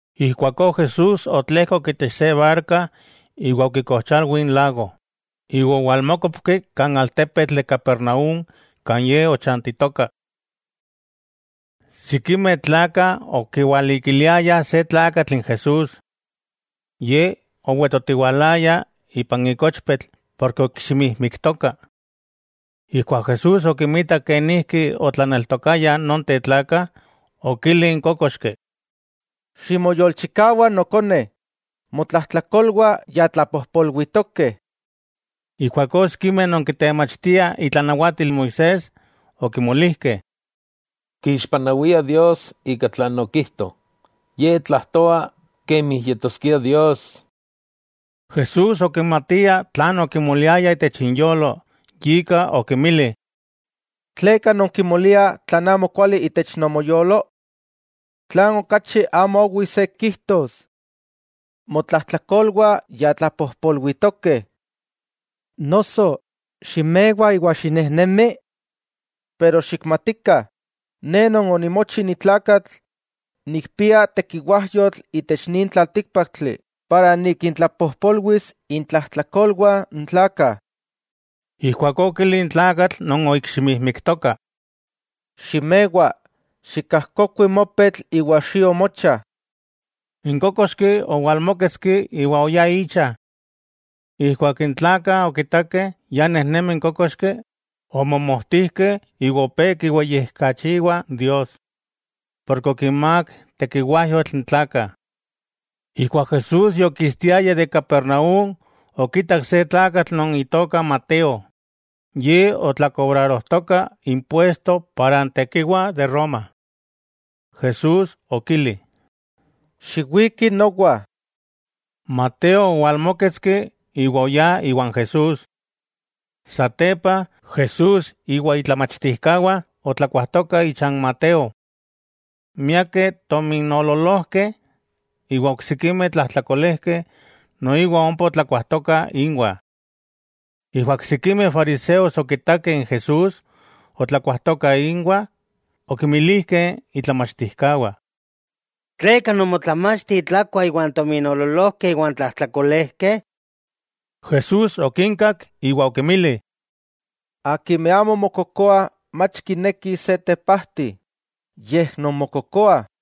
Ijkuakó Jesús otlejkok itech se barka iwa okikojchalwi n lago, iwa owalmókopki kan altepetl de Capernaúm kan Ye ochantitoka. Sikimeh tlakah okiwalikiliayah se tlakatl n Jesús. Ye owetotiwalaya ipan ikochpetl porke oikximijmiktoka. Ijkuak Jesús okimitak kenijki otlaneltokayah nonteh tlakah, okili n kókoxki: —Ximoyolchikawa nokone, motlajtlakolwah ya tlapojpolwitokeh. Ijkuakó sikimeh non kitemachtiah itlanawatil Moisés okimolijkeh: “Kixpanawia Dios ika tlan okijto. Ye tlajtoa kemi yetoskia Dios.” Jesús okimatia tlan okimoliayah itech inyolo, yika okinmili: —¿Tleka nonkimoliah tlan amo kuali itech nomoyolo? ¿Tlan okachi amo owi se kijtos: “Motlajtlakolwah ya tlapojpolwitokeh”, noso: “Ximewa iwa xinejnemi”? Pero xikmatikah, Ne Non onimochi ni tlakatl, nikpia tekiwajyotl itech nin tlaltíkpaktli para nikintlapojpolwis intlajtlakolwah n tlakah. Ijkuakó okili n tlakatl non oikximijmiktoka: —Ximewa, xikajkokui mopetl iwa xio mocha. N kókoxki owalmóketski iwa oyá icha. Ijkuak n tlakah okitakeh ya nejnemi n kókoxki, omomojtijkeh iwa opé kiweyijkachiwah Dios, porke okinmák tekiwajyotl n tlakah. Ijkuak Jesús yokistiaya de Capernaúm, okitak se tlakatl non itoka Mateo. Ye okololoaya impuesto para n tekiwa de Roma. Jesús okili: —Xiwiki nowa. Mateo owalmóketski, iwa oyá iwan Jesús. Satepa, Jesús iwa itlamachtijkawah otlakuajtokah icha n Mateo. Miakeh tominoololojkeh iwa oksikimeh tlajtlakolejkeh noiwa ompa otlakuajtokah inwah. Ijkuak sikimeh fariseos okitakeh n Jesús otlakuajtoka inwah, okinmilijkeh itlamachtijkawah: —¿Tleka nomotlamachti tlakua iwan tominoololojkeh iwan tlajtlakolejkeh? Jesús okinkak iwa okinmili: —Akimeh amo mokokoah mach kinekih se tepajti, yej non mokokoah.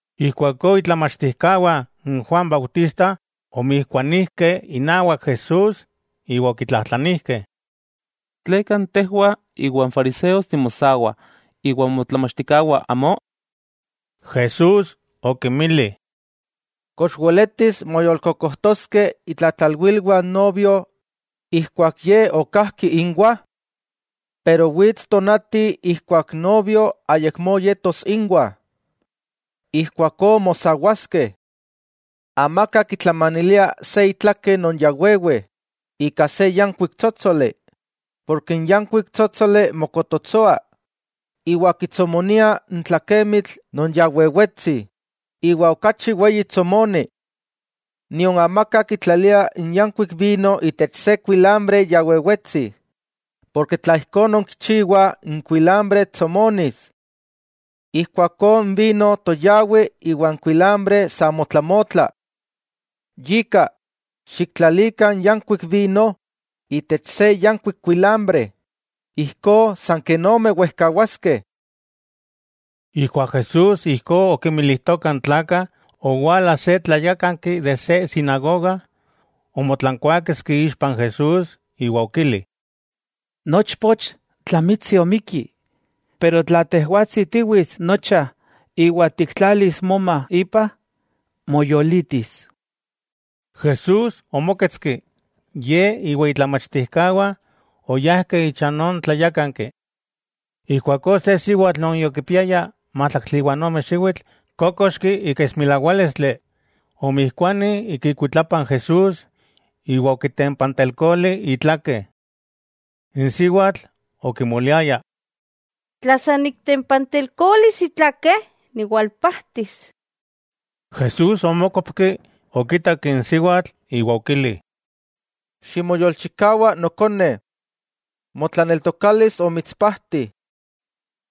Ijkuakó itlamachtijkawah n Juan Bautista omijkuanijkeh inawak Jesús iwa okitlajtlanijkeh: —¿Tleka tejwah iwa n fariseos timosawah iwa motlamachtijkawah, amó? Jesús okinmili: —¿Kox weletis moyolkokojtoskeh itlatlalwilwah n novio ijkuak ye ok kajki inwah? Wits tonati ijkuak n novio ayakmó yetos inwah, ijkuakó mosawaskeh. 'Amaka kitlamanilia se itlake non ya wewe ika se yankuik tsótsoli, porke n yankuik tsótsoli mokototsoa iwa kitsomonia n tlakemitl non ya wewetsi, iwa okachi weyi tsomoni. Nion amaka kitlalia n yankuik vino itech se kuilambre ya wewetsi, porke tla ijkó nonkichiwah n kuilambre tsomonis. Ijkuakó n vino toyawi iwa n kuilambre sa motlamotla. Yika, xiktlalikah n yankuik vino itech se yankuik kuilambre, ijkó san ken ome wejkawaskeh. Ijkuak Jesús ijkó okinmilijtoka n tlakah, owala se tlayákanki de se sinagoga, omotlankuaketski ixpa n Jesús, iwa okili: —Nochpoch tlamitsi omikki, pero tla tejwatsi tiwits nocha iwa tiktlalis moma ipa, moyolitis. Jesús omóketski, Ye iwa itlamachtijkawah oyajkeh icha non tlayákanki. Ijkuakó se siwatl non yokipiaya májtlaktli iwa n ome xiwitl kókoxki ika esmilawálistli, omijkuani ik ikuitlapa n Jesús iwa okitempantelkoli itlakeh. N siwatl okimoliaya: “Tla san niktempantelkolis itlake, niwalpajtis.” Jesús omókopki, okitak n siwatl iwa okili: —Ximoyolchikawa nokone, motlaneltokalis omitspajti.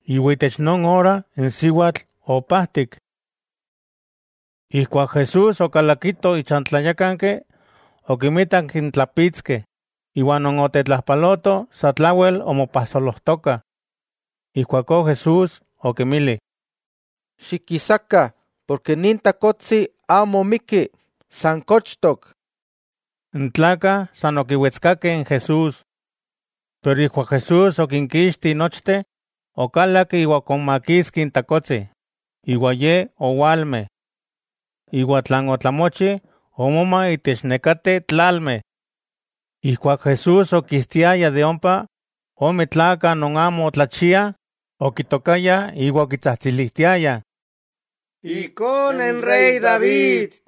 Itech non ora n siwatl opajtik. Ijkuak Jesús okalakito icha n tlayákanki, okinmitak n tlapitskeh, iwa non otetlajpalotoh sa tlawel omopajsolojtokah. Ijkuakó Jesús okinmili: —Xikisakah, nin takotsi amo omikki, san kochtok. N tlakah san okiwetskakeh n Jesús. Pero ijkuak Jesús okinkixti nochteh, okalak iwa okonmakitski n takotsi, iwa ye owalme. Iwa tlan otlamochi omoma itech nekateh tlalmeh. Ijkuak Jesús okistiaya de ompa, ome tlakah non amo tlachiah okitokayah iwa okitsajtsilijtiayah: —¡Techiknomati Ikone n rey David!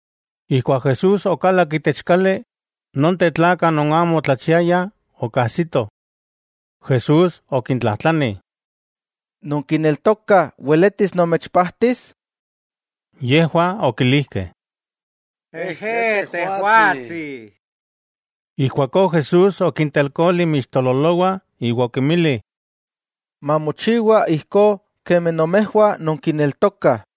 Ijkuak Jesús okalak itech kali, nonteh tlakah non amo otlachiayah okajsitoh. Jesús okintlajtlani: —¿Nonkineltokah weletis nomechpajtis? Yejwah okilijkeh: —Ejé Tejwatsi. Ijkuakó Jesús okintelkoli inmixtololowah iwa okinmili: —Mamochiwa ijkó kemi nomejwah nonkineltokah.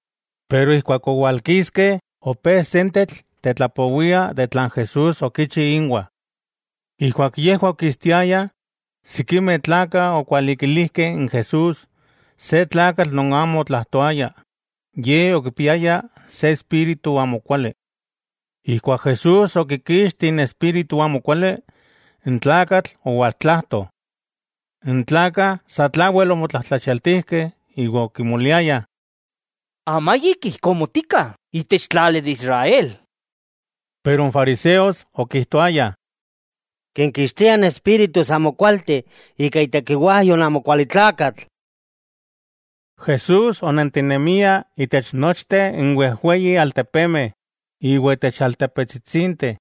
Pero ijkuak owalkiskeh, opé sentetl tetlapowiah tlan Jesús okichi inwah. Ijkuak yejwah okistiayah, sikimeh tlakah okwalikilijkeh n Jesús se tlakatl non amo otlajtoaya. Ye okipiaya se espíritu amokuali. Ijkuak Jesús okikixti n espíritu amokuali, n tlakatl owaltlajto. N tlakah sa tlawel omotlajtlachialtijkeh iwa okimoliayah: —Amayik ijkó motikah itech tlali de Israel. Pero n fariseos okijtoayah: —Kinkixtia espíritus amokualteh ika itekiwajyo n amokualitlakatl. Jesús onentinemia itech nochteh n wejweyi altepemeh iwa itech altepetsitsinteh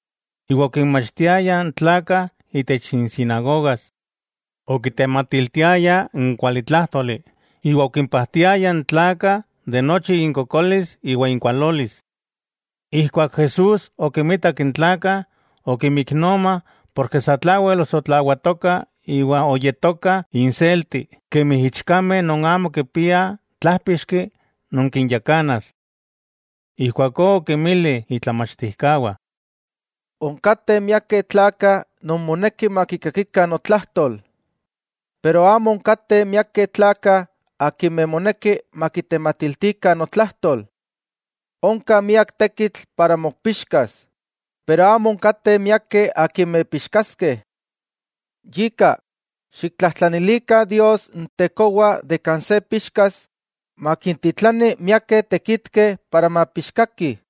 iwa okinmachtiaya n tlakah itech insinagogas. Okitematiltiaya n kualitlájtoli, iwa okimpajtiaya n tlakah de nochi inkokolis iwa inkualolis. Ijkuak Jesús okimitak n tlakah, okimiknoma ken sa tlawel osotlawatokah iwa oyetokah inselti kemi ichkameh non amo kipiah tlajpixki non kinyakanas. Ijkuakó okinmili itlamachtijkawah: —Onkateh miakeh tlakah non moneki makikakikah notlajtol, pero amo onkateh miakeh tlakah akimeh moneki makitematiltikah notlajtol. Onka miak tekitl para mopixkas, pero amo onkateh miakeh akimeh pixkaskeh. Yika, xiktlajtlanilikah Dios n Tekowa de kan se pixkas, makintitlani miakeh tekitkeh para mapixkakih.